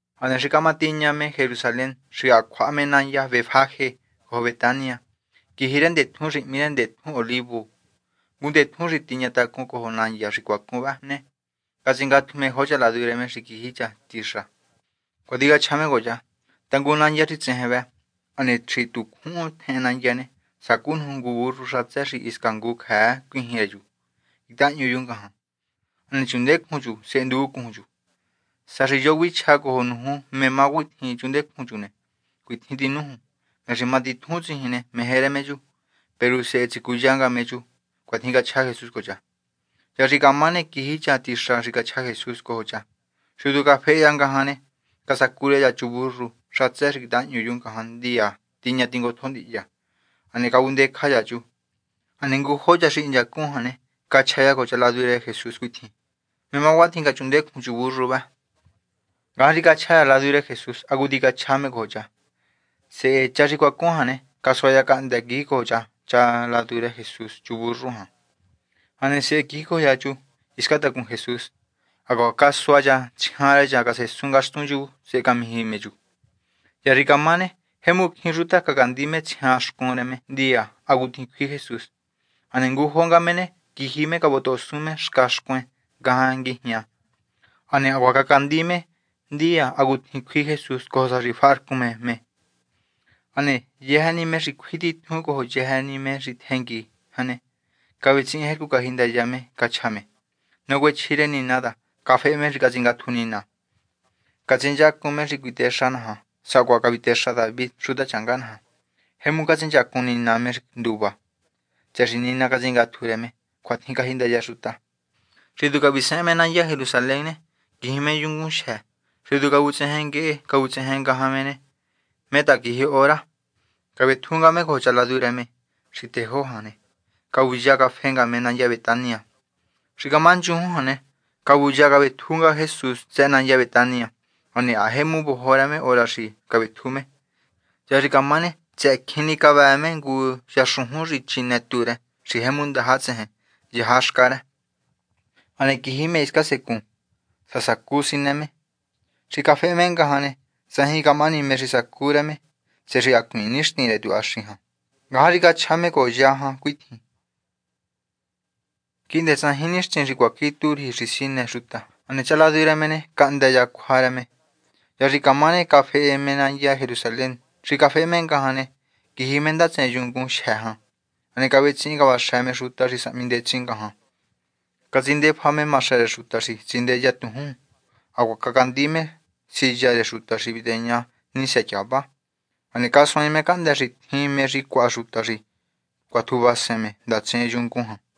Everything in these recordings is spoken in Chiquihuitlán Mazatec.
Hane xi camatiña me Jerusalén xi ha cjuaha me nandya Betfajé cojo Betania, quiji me ndetjun xi hmí rë Ndetjun Olivu, ngu ndetjún xi tiña tacun cojo nandya xi cuacun vëhë ne, catsingatju me jo cha ladu rë me quiji cha tixa. Cuatjin cachja me cojo cha: ―Tangun nandya xi tsejen vë. Hane xi tu cjuhun tjehen nandya ne, sacú nuju ngu burru xatsë xi hisca ngu cjëë cuijin rë chu, quitahahñu chu ngajan. Hane chundecjun chu, sehe nduvuncujun chu. Sá xi yo xi cuichja cojo nuju ta: “¿Mé má cuatjin chundecjun chu ne?”, cuitjin tinújun: “Me xi matitjun tsijin meje rë me chu. Peru sehe tsicuya nga me chu.” ―Cuatjin cachja Jesús cojo cha. Hya xi camá ne, quiji cha tixa xi cachja Jesús cojo cha. Xi tu cafehe cha ngajan ne, casacu rë cha ngu chu burru xatsë quitahahñu chu ngajan ndiya tiña tingotjo ndihya. Hane cavundecja cha chu. Hane ngujo cha xi hinchacun jan ne, cachja cha cojo cha ladu rë Jesús cuitjin: ―¿Mé má cuatjin cachundecjun chu burru vë? Ngajan xi cachja cha ladu rë Jesús hacutjin cachja me cojo cha. Sehe cha xi cuacun jan ne, casua cha cahndë́ quijicojo cha cha ladu rë Jesús chu burru jan. Hane sehe quijicojo cha chu hiscan tacun Jesús. Hacuaha casua cha tsjian rë cha casesun ngaxtun chu sehe camiji me chu. Hya xi camá ne, jemu cjín xuta xi cacandi me tsjian xcun rë me ndiya hacutjin cjui Jesús. Hane ngujo nga me ne quiji cavotohosun me xca xcuen ngajan nguijña, hane hacuaha cacandi me ndiya hacutjin cjui Jesús cojo sa xi tifaharcun me me. Hane yëjë me xi cjui titjun cojo yëjë me xi tjengui jan ne, cavetsihin jercu cajindaya me cachja me: ―Nacuechji rë Nina ta cafehe me xi catsingatju Nina. Catsinchacun me me xi cuitexa naja sacuaha cavitexa David xutachanga naja. Jemu catsinchacun Nina me xi nduva tsëhë xi Nina catsingatju rë me. ―Cuatjin cajindaya xuta. Xi tu cavisehen me nandya Jerusalén ne, quiji me yungun xi matitjun. Xi tu cavutsejen nguehe cavutsejen ngajan me ne, mé ta quiji hora ne, cavetju nga me cojo cha ladu rë me xi tejó jan ne, cavuya cafehe nga me nandya Betania. Xi camá nchujun jan ne, cavuya cavetju nga Jesús tsëhë nandya Betania. Hane ha jemu vojo rë me hora xi cavetju me. Hya xi camá ne, tsëhë cjin ni cavëë me ngu yaxujun xi chine tú rë xi jemu ndaja tsejen yaha xca rë. Hane quiji me hiscan secun, sá sacu sinë me. Peru xi cafehe me ngajan ne, tsajin camahani mé xi casacu rë me, tsëhë xi hacuiin nixtin rë tuhaxi jan. Ngajan xi cachja me cojo ya jan cuitjin: ―Quihndë tsajin nixtin xi cuaqui tú riji xi sinë xuta. Hane cha ladu rë me ne, cahndë cha cjua rë me. Hya xi camá ne, cafehe me nandya Jerusalén. Xi cafehe me ngajan ne, quiji me ndatsen yungun xi matitjun jan. Hane cavetsihin cavaxë me xuta xi sahmi ndetsin ngajan. Catsindefa me maxë rë xuta xi tsindeya tujún. Hacuaha cacandi me siya rë xuta xi viteña nisë tyava. Hane casuaain me cahndë́ xi tjin mé xi cjuaha xuta xi cuatjuvasen me ndatsen yungun jan.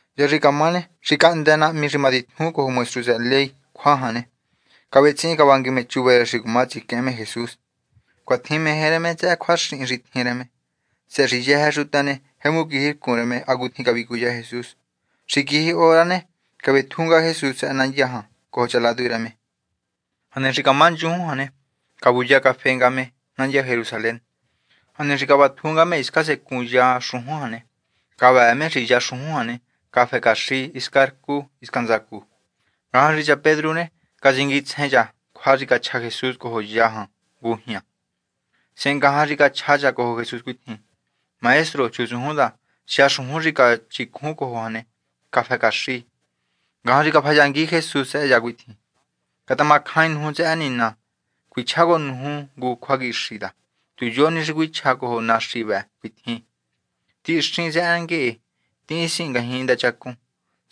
Hya xi camá ne, xi cahndë nahmi xi matitjun cojo maestru tsëhë ley cjua jan ne, cavetsihin cavangui me chuva rë xi cuma tsiquehen me Jesús. Cuatjin meje rë me tsëhë cjuaxin xi tjin rë me, tsëhë xi yëjë xuta ne, jemu quijircun rë hacutjin cavicuya Jesús. Xi quiji hora ne, cavetju nga Jesús tsëhë nandya jan cojo cha ladu rë me. Hane xi camá nchujun jan ne, cavuya cafe nga me nandya Jerusalén. Hane xi cavatju nga me hiscan secun ya xujun jan ne, cavëë me xi ya xujun jan ne, cafë caxi hisca rcu hisca ntsacu. Ngajan xi cha Pedru ne, catsinguitsjen cha cjua xi cachja Jesús cojo ya jan ngujña ne, sehe ngajan xi cachja cha cojo Jesús cuitjin: ―Maestro. Chutsujun ta ya xujun xi canújuncjun cojo jan ne, cafë caxi. Ngajan xi cafayangui Jesús tsëhë cha cuitjin: ―Catamacjain nuju tsëhë Nina. Cuichjá cojo nuju ngu cjuaquixi ta tu yo ni xi cuichja cojo naxi vëhë cuitjin: “Tihinxin tsëhë nguehe, tihin tisihin ngajñi ndachacun”,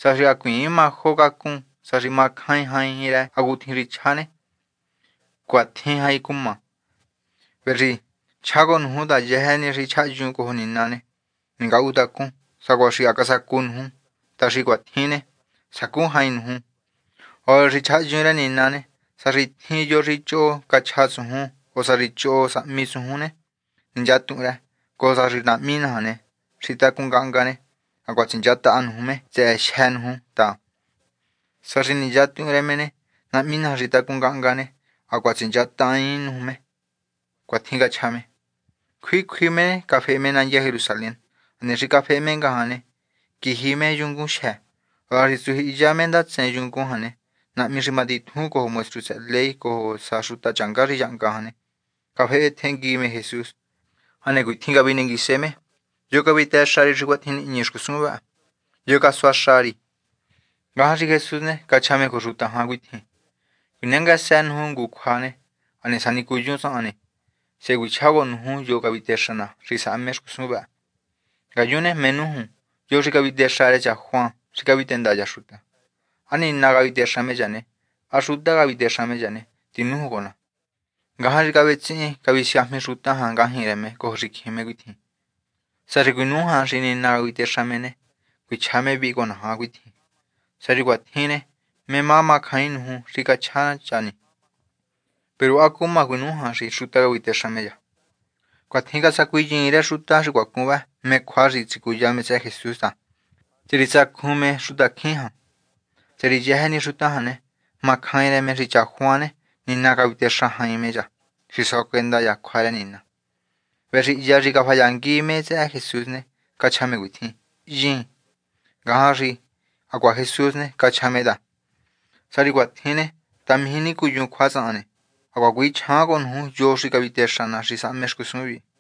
sá xi hacuiin majo cacun, sá xi macjain jain rë hacutjin xi cachja ne, cuatjin jain cuma. Vëhë xi chjá cojo nuju ta yëjë ni xi chjahyun cojo Nina ne, ningatuhuntacun sacuaha xi ha casacu nuju ta xi cuatjin ne, sacu jain nuju. Hora xi chjahyun rë Nina ne, sá xi tjin yo xi choho cachja tsujun, o sá xi choho casahmi tsujun ne, ninchatuhun rë, cojo sa xi Nahmi naja xi tacun ngahnga ne, hacuaha tsinchataha nuju me tsëhë jyë́ nuju ta, sá xi ninchatuun rë me ne, Nahmi naja xi tacun ngahnga ne, hacuaha tsinchataain nuju me. ―Cuatjin cachja me. Cjui cjui me ne, cafehe me nandya Jerusalén. Hane xi cafehe me jan ne, quiji me yungun xi matitjun. Hora xi tsujyihiya me ndatsen yungun jan ne, nahmi xi matitjun cojo maestru tsëhë ley cojo sa xuta changá xi yahnga jan ne, cafehe tjengui me Jesús. Hane cuitjin cavinenguise me: ―¿Yo cavitexa ri xi cuatjin nihñi xcusun vë? ¿Yo casuaxa ri? Ngajan xi Jesús ne, cachja me cojo xuta jan cuitjin: ―Cjuinenguësë nuju ngu cjua. Hane sá xi nicuyun tsahan ne, sehe cuichjá cojo nuju yo cavitexa ná xi sahme xcusun vëhë. Ngayun mé nújun, ¿Yo xi cavitexa rë cha Juan xi cavitenda cha xuta? ¿Há Nina cavitexa me cha ne, há xuta cavitexa me cha? Tinújun cojo ná. Ngajan xi vetsihin visiajmi xuta jan ngajñi rë me cojo xicjin me cuitjin: ―Sá xi cuinújan xi Nina cavitexa me ne, cuichja me vihi cojo naja cuitjin: “Sá xi cuatjin ne, ¿mé má camacjaain nuju xi cachja cha ni?” Peru ¿há cuma cuinújan xi xuta cavitexa me cha? Cuatjin casacuinyiin rë xuta xi cuacun vë mé cjua xi tsicuya me tsëhë Jesús ta, tsëhë xi tsacjun me xutacjín, tsëhë xi yëjë ni xuta jan ne, macjain rë me xi cha Juan ne, Nina cavitexa jain me cha xi suacuenda cha cjua rë Nina. Vëhë xi hya xi cafayangui me tsëhë Jesús ne, cachja me cuitjin: ―Hyiin. Ngajan xi hacuaha Jesús ne, cachja me ta: ―Sá xi cuatjin ne, ta mijí nicuyun cjua tsahan ne, hacuaha cuichjaain cojo nuju yo cavitexa ná xi sahme xcusun vihi.